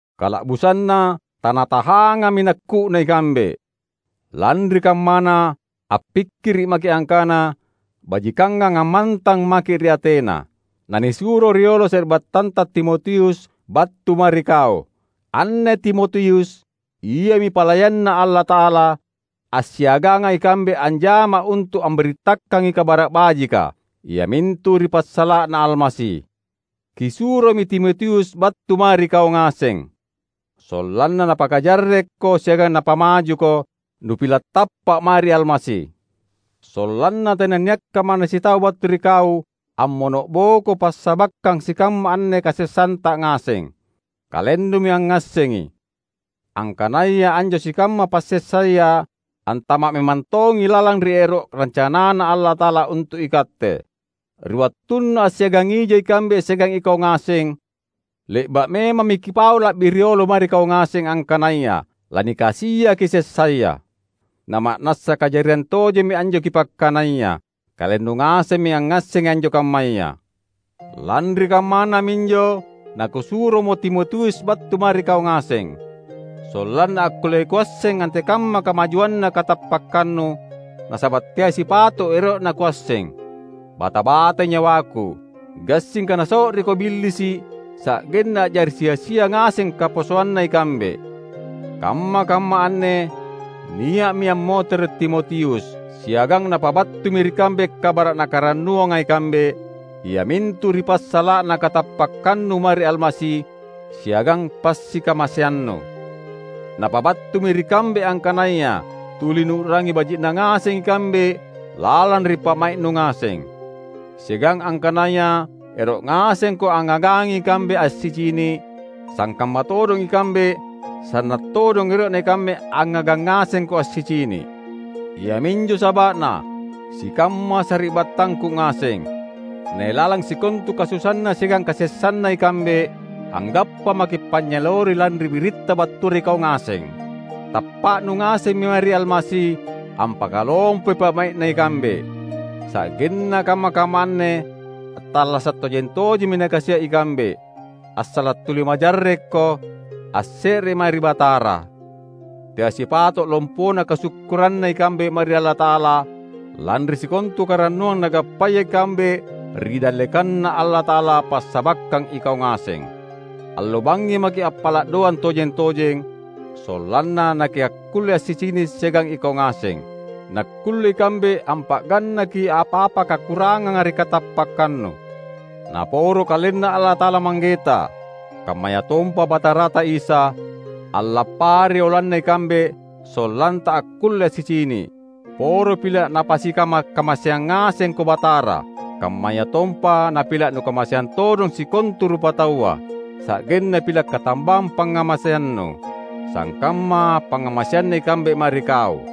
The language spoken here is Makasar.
Kala’busanna tanatahangami nakku’na ikambe. Lanri kammana appikkiri’ maki’ angkana bajikangang ammantang maki’ ri Atena, nanisuro riolo sari’battanta Timotius battu mae ri kau: Anne Timotius, iami palayanNa Allata’ala, assiaganga ikambe anjama untu’ ambirittakangi Kabara’ Bajika, iamintu ri passala’na Almasi. Kisuromi Timotius battu mae ri kau ngaseng, sollanna napakajarrekko siagang napamajuko nupila’ tappa’ mae ri Almasi. Sollanna tenanniakka manna sitau battu ri kau ammono’boko passabakkang sikamma anne kasessanta ngaseng. Kalennumi angngassengi, angkanaya anjo sikamma passessaya antama’ memang tongi lalang ri ero’ rancanaNa Allata’ala untu’ ikatte. Ri wattunna assiagangija ikambe siagang ikau ngaseng, le’ba’ memammi kipau la’bi riolo mae ri kau ngaseng angkanaya lanikasiaki sessaya. Na ma’nassa kajariang tojemmi anjo kipakkanaya; kalennu ngasemmi angngassengi anjo kammaya. Lanri kammana minjo nakusuromo Timotius battu mae ri kau ngaseng, sollanna akkulle kuasseng antekamma kamajuanna katappakkannu, nasaba’ teai sipato’ ero’na kuasseng. Bata-batai nyawaku, gassingka naso’riko Billisi’ sa’genna a’jari sia-sia ngaseng kaposoanna ikambe. Kamma-kamma anne nia’mi ammotere’ Timotius; siagang napabattumi ri kambe kabara’ nakarannuanga ikambe, iamintu ri passala’na katappakkannu mae ri Almasi siagang passikamaseannu. Napabattumi ri kambe angkanaya tuli nuu’rangi baji’na ngaseng ikambe lalang ri pa’mai’nu ngaseng. Siagang angkanaya ero’ ngasengko angngagangi ikambe assicini’, sangkamma todong ikambe sanna’ todong ero’na ikambe angngagang ngasengko assicini’. Iaminjo saba’na, sikamma sari’battangku ngaseng, nailalang sikontu kasusaanna siagang kasessanna ikambe, anggappa maki’ panynyaleori lanri biritta battua ri kau ngaseng. Tappa’nu ngasemmi mae ri Almasi ampakalompoi pa’mai’na ikambe; sa’genna kamma-kamma anne attallasa’ tojeng-tojemmi nakasia’ ikambe, assala’ tuli majarrekko, asse’re mae ri Batara. Teai sipato’ lompona kasukkuranna ikambe mae ri Allata’ala lanri sikontu karannuang nagappaya ikambe ri dallekanNa Allata’ala passabakkang ikau ngaseng. Allo bangngi maki’ appala’ doang tojeng-tojeng, sollanna nakiakkulle assicini’ siagang ikau ngaseng, nakkulle ikambe ampa’gannaki apa-apa kakuranganga ri katappakkannu. Naporo KalenNa Allata’ala Manggeta, kammayatompa Batarata Isa, allappari oloanna ikambe sollanta akkulle assicini’! Poro pila’ Napasikama’-kamaseang ngasengko Batara, kammayatompa napila’ nukamaseang todong sikontu rupataua, sa’genna pila’ katambang pangngamaseannu, sangkamma pangngamaseanna ikambe mae ri kau.